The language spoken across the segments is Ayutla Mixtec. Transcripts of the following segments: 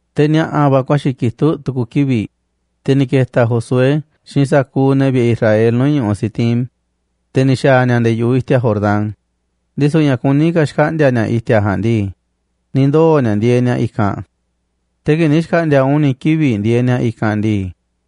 Te̱ ni̱a̱ꞌa̱ va̱ ku̱a̱xi̱ kitúꞌ tu̱ku̱ kivi̱ꞌ, te̱ ni̱ keta̱ Josué xiinꞌ sa̱kuuꞌ ne̱ vi̱ꞌe̱ Israel nuu̱ꞌ ñu̱ꞌuꞌ Sitim, te̱ ni̱ xa̱a̱ ni̱a̱ nde̱e̱ yu̱ꞌuꞌ i̱ti̱a̱ Jordán, ndisu̱ ña̱ kuní ka̱ xkaꞌndi̱a̱ ni̱a̱ i̱ti̱a̱ ja̱a̱nꞌ ndii, ni̱ ndoo̱ ni̱a̱ ndieeꞌ ni̱a̱ i̱kanꞌ. Te̱ kii̱ꞌ ni̱ xkaꞌndi̱a̱ uni̱ kivi̱ꞌ ndieeꞌ ni̱a̱ i̱kanꞌ ndii,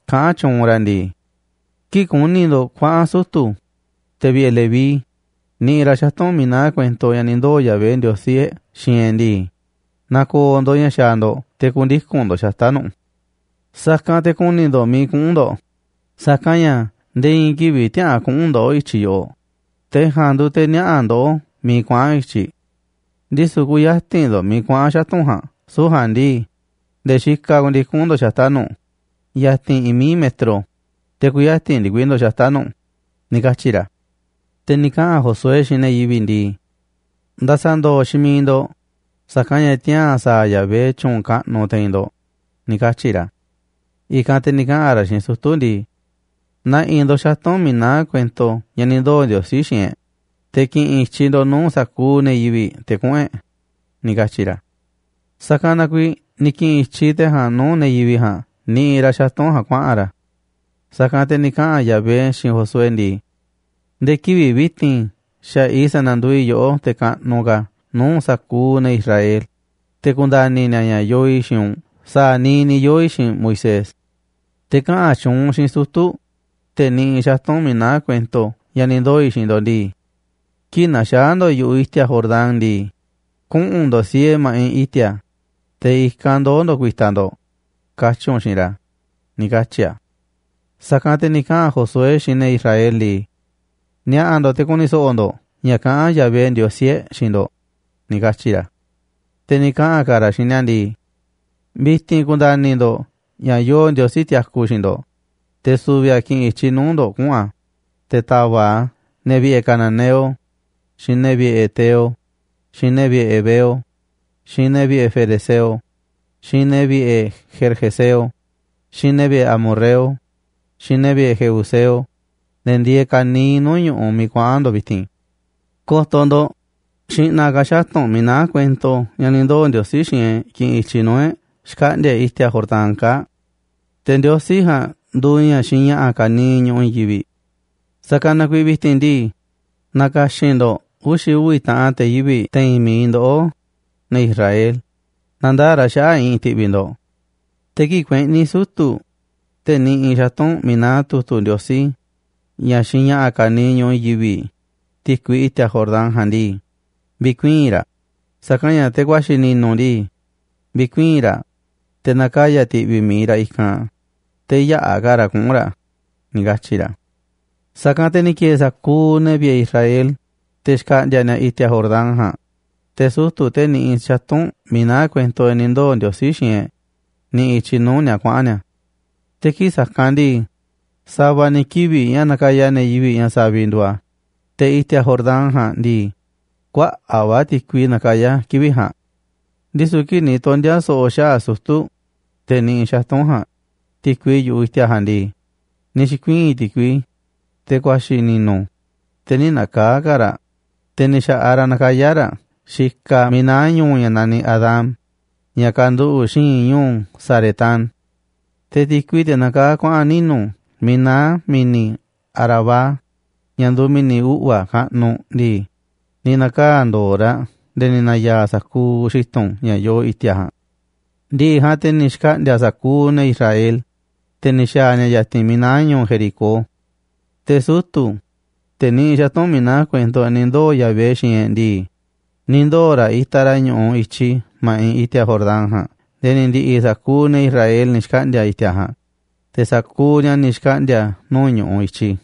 kaꞌán tyuunꞌ ra̱ ndii: ―Kii̱ꞌ ku̱ni̱ ndo̱ꞌ kuaꞌa̱n sutu̱, te̱ vi̱ꞌe̱ Leví, niꞌiꞌ ra̱ xatu̱nꞌ miiꞌ naá kuento ña̱ ni̱ ndoo̱ Yahvé, Ndiosí e̱ꞌ, xiinꞌ e̱ꞌ ndii, na̱ko̱o̱ ndo̱ꞌ ña̱ xaaꞌ ndo̱ꞌ te̱ ku̱ndiku̱n ndo̱ꞌ xata̱ꞌ nu̱ꞌ. Sa̱kanꞌ te̱ ku̱ni̱ ndo̱ꞌ miiꞌ kuꞌu̱n ndo̱ꞌ, sa̱kanꞌ ña̱ nde̱e̱ i̱i̱n kivi̱ꞌ tiäꞌa̱an kuꞌu̱n ndoꞌó i̱tyiꞌ yoꞌoꞌ, te̱ ja̱a̱nꞌ nduuꞌ te̱ niaꞌa̱ ndoꞌó miiꞌ kuaꞌa̱n i̱tyiꞌ. Ndisu̱ kü̱ya̱ti̱n ndo̱ꞌ miiꞌ kuaꞌa̱n xatu̱nꞌ ja̱a̱nꞌ, süu̱ꞌ ja̱a̱nꞌ ndii, nde̱e̱ xikaꞌ ku̱ndiku̱n ndo̱ꞌ xata̱ꞌ nu̱ꞌ, yatinꞌ i̱i̱n mií metro, te̱ kü̱ya̱ti̱n ndikui ndo̱ꞌ xata̱ꞌ nu̱ꞌ ―ni̱ katyi̱ ra̱. Te̱ ni̱ kaꞌa̱n Josué xiinꞌ ne̱ yivi̱ꞌ ndii: ―Nda̱sa̱ndo̱o̱ xiinꞌ miiꞌ ndo̱ꞌ, sa̱kanꞌ ña̱ tiaa̱n sa̱a̱ Yahvé tyu̱u̱n kaꞌnuꞌ te̱i̱n ndo̱ꞌ ―ni̱ katyi̱ ra̱. I̱kanꞌ te̱ ni̱ kaꞌa̱n ra̱ xiinꞌ sutu̱ ndii: ―Na̱ꞌi̱ ndo̱ꞌ xatu̱nꞌ miiꞌ naá kuento ña̱ ni̱ ndoo̱ Ndiosí xiinꞌ e̱ꞌ, te̱ ki̱ꞌi̱n i̱tyiꞌ ndo̱ꞌ nuu̱ꞌ sa̱kuuꞌ ne̱ yivi̱ꞌ te̱ kuꞌu̱n e̱ꞌ ―ni̱ katyi̱ ra̱. Sa̱kanꞌ na kuiiꞌ ni̱ ki̱ꞌi̱n i̱tyiꞌ te̱ ja̱a̱nꞌ nuu̱ꞌ ne̱ yivi̱ꞌ ja̱a̱nꞌ niꞌiꞌ ra̱ xatu̱nꞌ ja̱a̱nꞌ kuaꞌa̱n ra̱. Sa̱kanꞌ te̱ ni̱ kaꞌa̱n Yahvé xiinꞌ Josué ndii: ―Nde̱e̱ kivi̱ꞌ vi̱ti̱n xa̱ꞌaꞌ i̱ sa̱na̱nduuꞌ i̱ yoꞌó te̱ kaꞌnuꞌ ka̱ nuu̱ꞌ sa̱kuuꞌ ne̱ Israel, te̱ ku̱nda̱ni̱ ni̱a̱ ña̱ yoo i̱ xiinꞌ u̱nꞌ sa̱a̱ niiꞌ ni̱ yoo̱ i̱ xiinꞌ Moisés. Te̱ kaꞌa̱n tyuunꞌ u̱nꞌ xiinꞌ sutu̱, te̱ niꞌiꞌ xatu̱nꞌ miiꞌ naá kuento ña̱ ni̱ ndoo̱ i̱ xiinꞌ ndo̱ꞌ ndii: “Kii̱ꞌ na̱xaa̱ ndo̱ꞌ yu̱ꞌuꞌ i̱ti̱a̱ Jordán ndii, kuꞌu̱n ndo̱ꞌ siee ma̱ꞌiꞌ i̱ti̱a̱, te̱ i̱kanꞌ ndoo̱ ndo̱ꞌ ku̱i̱ta̱ ndo̱ꞌ”, katyi̱ u̱nꞌ xiinꞌ ra̱ ―ni̱ katyi̱ a̱. Sa̱kanꞌ te̱ ni̱ kaꞌa̱n Josué xiinꞌ ne̱ Israel ndii: ―Ni̱a̱ꞌa̱ ndo̱ꞌ te̱ ku̱ni̱ so̱ꞌo̱ ndo̱ꞌ ña̱ kaꞌán Yahvé, Ndiosí e̱ꞌ, xiinꞌ ndo̱ꞌ ―ni̱ katyi̱ ra̱. Te̱ ni̱ kaꞌa̱n ka̱ ra̱ xiinꞌ ni̱a̱ ndii: ―Vi̱ti̱n ku̱nda̱ni̱ ndo̱ꞌ ña̱ yoo Ndiosí tiaku xiinꞌ ndo̱ꞌ, te̱ su̱vi̱ a̱ ki̱ꞌi̱n i̱tyiꞌ nuu̱ꞌ ndo̱ꞌ kuꞌu̱n a̱, te̱ ta̱va̱ꞌ a̱ ne̱ vi̱ꞌe̱ cananeo, xiinꞌ ne̱ vi̱ꞌe̱ heteo, xiinꞌ ne̱ vi̱ꞌe̱ heveo, xiinꞌ ne̱ vi̱ꞌe̱ ferezeo, xiinꞌ ne̱ vi̱ꞌe̱ gergeseo, xiinꞌ ne̱ vi̱ꞌe̱ amorreo, xiinꞌ ne̱ vi̱ꞌe̱ jebuseo, ne̱ ndieeꞌ ka̱niiꞌ nuu̱ꞌ ñu̱ꞌuꞌ miiꞌ kuaꞌa̱n ndo̱ꞌ vi̱ti̱n. Ko̱to̱ ndo̱ꞌ, xi̱ꞌna̱ ka̱ xatu̱nꞌ miiꞌ naá kuento ña̱ ni̱ ndoo̱ Ndiosí xiinꞌ e̱ꞌ ki̱ꞌi̱n i̱tyiꞌ nuu̱ꞌ e̱ꞌ xkaꞌndi̱a̱ e̱ꞌ i̱ti̱a̱ Jordán kaa̱ꞌ. Te̱ Ndiosí ja̱a̱nꞌ nduuꞌ ña̱ xiinꞌ ña̱ꞌa̱ ka̱niiꞌ ñu̱ꞌuꞌ i̱i̱n yivi̱ꞌ. Sa̱kanꞌ na kuiiꞌ vi̱ti̱n ndii, na̱ka̱xi̱n ndo̱ꞌ uxi̱ uvi̱ taꞌan te̱ yivi̱ꞌ te̱i̱n mi̱iꞌ ndoꞌó, ne̱ Israel, na̱ndaa̱ꞌ ra̱ xaꞌa̱ꞌ i̱ꞌi̱n ti̱ꞌvi̱ ndo̱ꞌ. Te̱ kii̱ꞌ kueꞌni̱ sutu̱, te̱ niꞌiꞌ xatu̱nꞌ miiꞌ naá tu̱tu̱ Ndiosí, ña̱ xiinꞌ ña̱ꞌa̱ ka̱niiꞌ ñu̱ꞌuꞌ i̱i̱n yivi̱ꞌ, ti̱kui i̱ti̱a̱ Jordán ja̱a̱nꞌ ndii, vi̱kuii̱n raꞌ, sa̱kanꞌ ña̱ teꞌ ku̱a̱xi̱ ni̱nu̱ ndii, vi̱kuii̱n raꞌ, te̱ na̱kaya̱ ti̱ꞌvi̱ mi̱iꞌ raꞌ i̱kanꞌ, te̱ yäꞌa̱ ka̱ raꞌ kuꞌu̱n ra̱ ―ni̱ katyi̱ ra̱. Sa̱kanꞌ te̱ ni̱ ki̱e̱e̱ sa̱kuuꞌ ne̱ vi̱ꞌe̱ Israel, te̱ xkaꞌndi̱a̱ ni̱a̱ i̱ti̱a̱ Jordán ja̱a̱nꞌ, te̱ sutu̱, te̱ niꞌiꞌ xatu̱nꞌ miiꞌ naá kuento ña̱ ni̱ ndoo̱ Ndiosí xiinꞌ e̱ꞌ, niꞌiꞌ i̱tyiꞌ nuu̱ꞌ ni̱a̱ kuaꞌa̱n ni̱a̱. Te̱ kii̱ꞌ sa̱kanꞌ ndii, sa̱va̱ ni̱ kivi̱ꞌ ña̱ nakaya ne̱ yivi̱ꞌ ña̱ saviꞌ nduuꞌ a̱, te̱ i̱ti̱a̱ Jordán ja̱a̱nꞌ ndii, kuaꞌa̱ꞌ va̱ ti̱kui nakayá kivi̱ꞌ ja̱a̱nꞌ. Ndisu̱ kii̱ꞌ ni̱ tondi̱a̱ so̱ꞌo̱ xaꞌa̱ꞌ sutu̱, te̱ niꞌiꞌ xatu̱nꞌ ja̱a̱nꞌ, ti̱kui yu̱ꞌuꞌ i̱ti̱a̱ ja̱a̱nꞌ ndii, ni̱ xi̱kuii̱n ti̱kui, teꞌ ku̱a̱xi̱ ni̱nu̱, te̱ nï̱ na̱kaa̱ꞌ ka̱ raꞌ, te̱ ni̱ xa̱ꞌaꞌ ra̱ nakayá ra̱ xikaꞌ miiꞌ naá ñu̱u̱ ña̱ naniꞌ Adam, ña̱ kanduꞌu̱ꞌ xi̱i̱nꞌ ñu̱u̱ Saretán. Te̱ ti̱kui, teꞌ nakaa̱ꞌ kuaꞌa̱n ninu̱ miiꞌ naá mi̱ni̱ Arabá, ña̱ nduuꞌ mi̱ni̱ uꞌva̱ kaꞌnuꞌ ndii, ni̱ na̱kaa̱ꞌ ndo̱o̱ raꞌ nde̱e̱ ni̱ na̱ya̱a̱ sa̱kuuꞌ xi̱tu̱n ña̱ yoo i̱ti̱a̱ ja̱a̱nꞌ. Ndi̱ꞌi̱ ja̱a̱nꞌ, te̱ ni̱ xkaꞌndi̱a̱ sa̱kuuꞌ ne̱ Israel, te̱ ni̱ xa̱a̱ ni̱a̱ ya̱ti̱n miiꞌ naá ñu̱u̱ Jericó. Te̱ sutu̱, te̱ niꞌiꞌ xatu̱nꞌ miiꞌ naá kuento ña̱ ni̱ ndoo̱ Yahvé xiinꞌ e̱ꞌ ndii, ni̱ ndoo̱ ra̱ itaꞌ ra̱ ñu̱ꞌuꞌ i̱tyi ma̱ꞌiꞌ i̱ti̱a̱ Jordán ja̱a̱nꞌ nde̱e̱ ni̱ ndi̱ꞌi̱ sa̱kuuꞌ ne̱ Israel ni̱ xkaꞌndi̱a̱ i̱ti̱a̱ ja̱a̱nꞌ, te̱ sa̱kuuꞌ ni̱a̱ ni̱ xkaꞌndi̱a̱ nuu̱ꞌ ñu̱ꞌuꞌ i̱tyi.